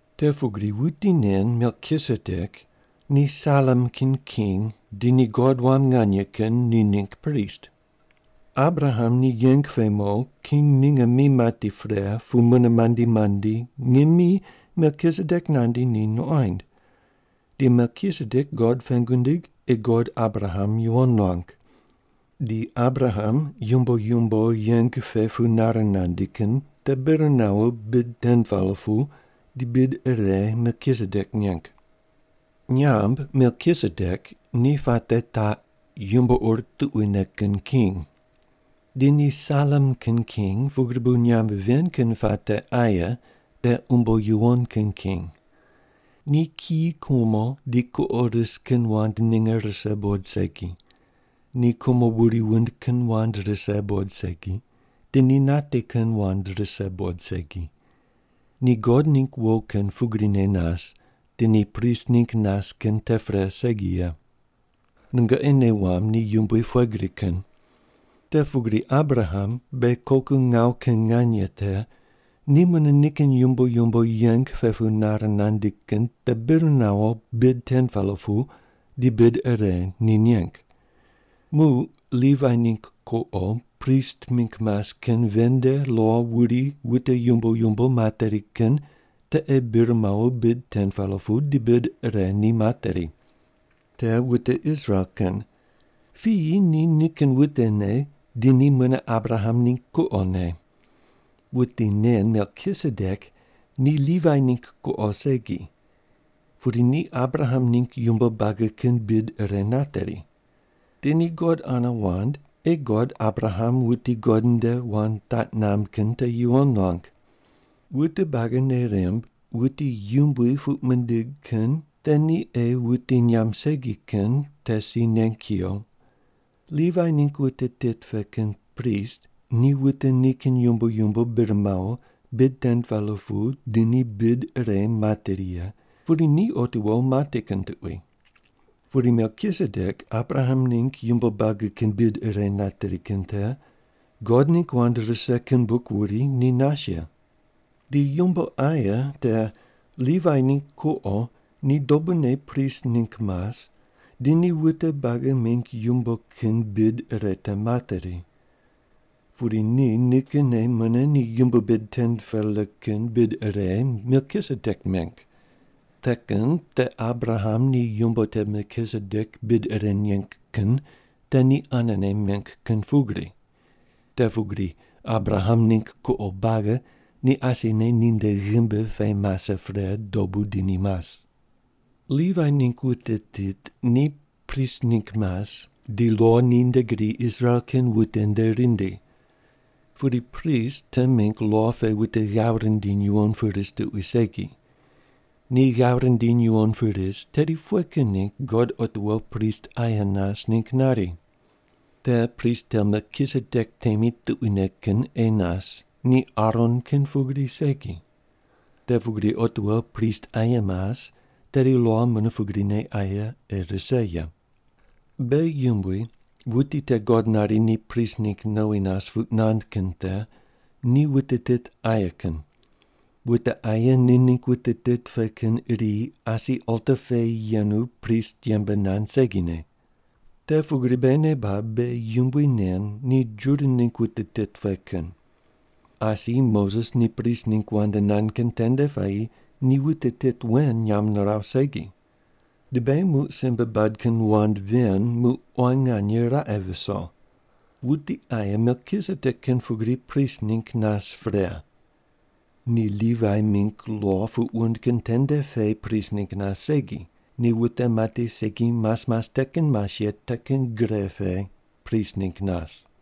Te pugri wuti nen Melkisedek ni Salem kin king di ni God Wam Nganye Kin ni ningg prist. Abraham ni yeng pe mo king ninge mi mati pre pu mune mandi mandi ngimi Melkisedek nandi ni nuqoind. Di Melkisedek God pengu nindig ei God Abraham yuwon nuang. Di Abraham yumbo yumbo yeng pe pu nare nandi kin te bir nawo bid 10-pela pu di bid ire Melkisedek neng. Nyamb Melkisedek ni puate taq, “Yumbo ur tuquine kin king.” Di ni Salem kin king pugri bu nyamb ven kin puate aye te “Umbo yuwon kin king.” Ni kiyi kumo di kuqo ris kin wand ninge rise buqod segi. Ni kumo wuri wundi kin wand rise buqod segi, di ni nati kin wand rise buqod segi. Ni God ningg wo kin pugrine nas di ni prist ningg nas kin te pre segi ye. Nungoqi nei wamb ni yumbui pughe gri kin. Te pugri Abraham beghi koku ngawu kin nganye te ni mune nikin yumbo yumbo yeng pe pu nare nandi kin te bir nawo bid 10-pela pu di bid ire ni neng. Muq Livai ningg kuqo prist ningg mas kin ven nde lo wuri wute yumbo yumbo materi kin te ei bir mawo bid 10-pela pu di bid ire ni materi. Te wute Israel kin. Piyi ni nikin wutene di ni mune Abraham ningg kuqone. Wuti nen Melkisedek ni Livai ningg kuqo segi, pudi ni Abraham ningg yumbo buagi kin bid ire nateri. Di ni God ane wand ei God Abraham wuti God ni nde wand taq namb kin te yuwon nuang. Wute buagi nei rimb wuti yumbui puq mindig kin te ni ei wuti nyamb segi kin te si neng kuyo. Livai ningg wute tit pe kin prist ni wute nikin yumbo yumbo bir mawo bid 10-pela pu di ni bid ire materi ye, pudi ni otiwo mati kin tuqui. Pudi Melkisedek Abraham ningg yumbo buagi kin bid ire nateri kin te, God ningg wand rise kin buk wuri ni nas ye. Di yumbo aye te, Livai ningg kuqo ni dobune prist ningg mas, di ni wute buagi mingg yumbo kin bid ire te materi. Pudi ni nikinne mune ni yumbo bid 10-pela kin bid ire Melkisedek meng. Te kin te Abraham ni yumbo te Melkisedek bid ire neng kin te ni anene meng kin pugri. Te pugri Abraham ningg kuqo buagi ni asine ninde ghimbi pe mase pre dobu di ni mas. Livai ningg wute tit ni prist ningg mas di lo ni nde gri Israel kin wute nde rindi. Pudi prist te mingg lo pe wute ghav rindiny yuwon ris tuqui segi. Ni ghav rindiny yuwon ris tedi pughe kin ningg God otiwo prist aye nas ningg nari? Te prist te Melkisedek temi tuquine kin ei nas, ni Aron kin pugri segi. Te pugri otiwo prist aye mas tedi lo mune pugrine aye ei rise ye. Beghi Yumbui, wuti te God nari ni prist ningg nowi nas puq nand kin te, ni wute tit aye kin. Wute aye ni ningg wute tit pe kin iri asi alta pe yenu prist yembe nand segine. Te pugri beghi nei bab beghi Yumbui nen ni Juda ningg wute tit pe kin. Asi Moses ni prist ningg wand nand kin tende puayi ni wute tit wen nyamb niraw segi. Di beghi muq simbe bad kin wand ven muq quan nganye raqe viso. Wuti aye Melkisedek kin pugri prist ningg nas pre. Ni Livai mingg lo puq wund kin tende pe prist ningg nas segi, ni wute mati segi mas mas te kin mas ye te kin gre pe prist ningg nas.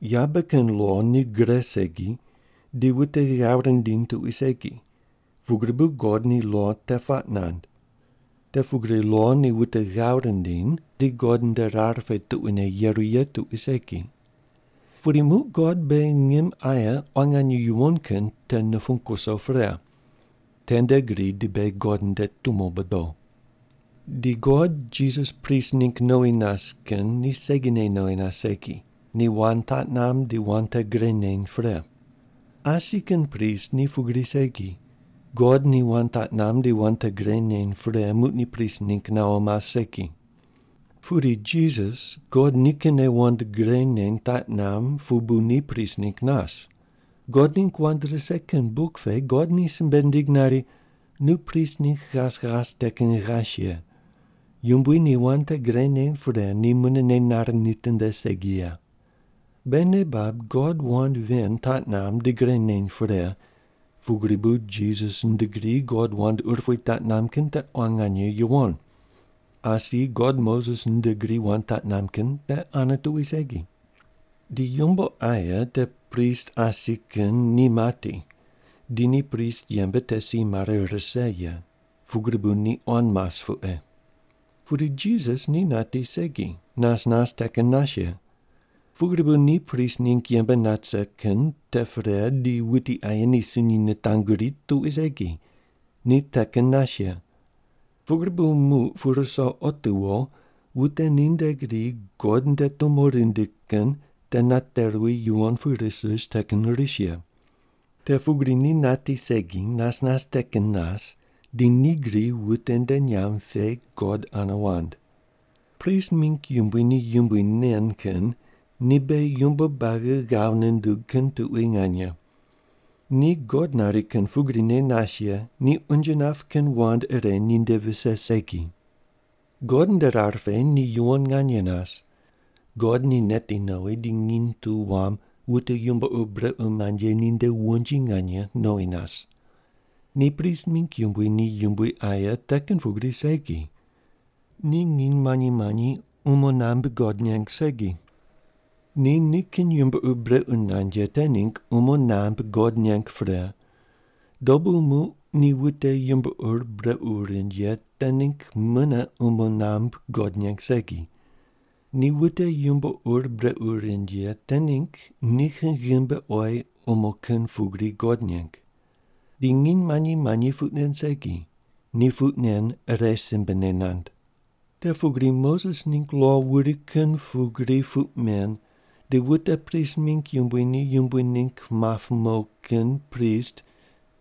Yabe kin lo ni gre segi di wute ghav rindiny tuqui segi, pugri bu God ni lo te puaq nand. Te pugri lo ni wute ghav rindiny di God nde rar pe tuquine yeru ye tuqui segi. Pudi muq God beghi ngim aye quan nganye yuwon kin te nupung wuso pre. Tende gri di beghi God nde tumo bodo. Di God Jisas prist ningg nowi nas kin ni segine nowi nas segi, ni wand taq namb di wand te gre neny pre. Asi kin prist ni pugri segi, God ni wand taq namb di wand te gre neny pre muq ni prist ningg nawo mas segi. Pudi Jisas God nikinne wand gre ye taq namb pu bu ni prist ningg nas. God ningg wand rise kin buk pe God ni simbe nindig nari, “Nu prist ningg ghas ghas te kin ghas ye. Yumbui ni wand te gre neny pre, ni mune nei nare nitinde segi ye.” Beghi nei bab God wand ven taq namb di gre neny pre, pugri bu Jisas nde gri God wand urupui taq namb kin te quan nganye yuwon. Asi God Moses nde gri wand taq namb kin te ane tuqui segi. Di yumbo aye te prist asi kin ni mati di ni prist yembe te si mare rise ye, pugri bu ni quan mas pu ei. Pudi Jisas ni nati segi nas nas te kin nas ye. Pugri bu ni prist ningg yembe nat rise kin te pre di wuti aye ni sunyi nitanguri tuqui segi, ni te kin nas ye. Pugri bu muq pu ruso otiwo wute ni nde gri God nde tumo rindi kin te nate ruwi yuwon pu ris ris te kin ris ye. Te pugri ni nati segi nas nas te kin nas di ni gri wute nde nyamb pe God ane wand. Prist mingg yumbui ni yumbui nen kin ni beghi yumbo buagi ghav nundug kin tuqui nganye. Ni God nari kin pugrine nas ye, ni unje nap kin wand ire ninde vise segi. God nde rar pe ni yuwon nganye nas. God ni neti nowi di nginy tu wam wute yumbo ur brequ mand ye ninde wonji nganye nowi nas. Ni prist mingg yumbui ni yumbui aye te kin pugri segi. Ni nginy manyi manyi umo nambui God neng segi. Ni nikin yumbo ur brequ nand ye te ningg umo nambui God neng pre, dobu muq di wute yumbo ur brequ rind ye te ningg mune umo nambui God neng segi. Ni wute yumbo ur brequ rind ye te ningg nikin ghimbi oyi umo kin pugri God neng. Di nginy manyi manyi puq nen segi, ni puq nen ire simbene nand. Te pugri Moses ningg lo wuri kin pugri puq men di wute prist mingg yumbui ni yumbui ningg map mo kin prist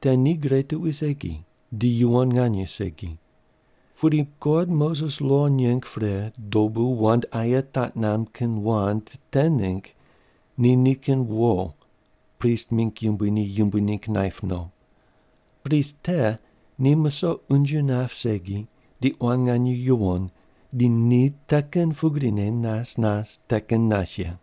te ni gre tuqui segi di yuwon nganye segi. Pudi God Moses lo neng pre dobu wand aye taq namb kin wand te ningg ni nikin wo prist mingg yumbui ni yumbui ningg naip no. Prist te ni musoq unje nap segi ni quan nganye yuwon di ni te kin pugrine nas nas te kin nas ye.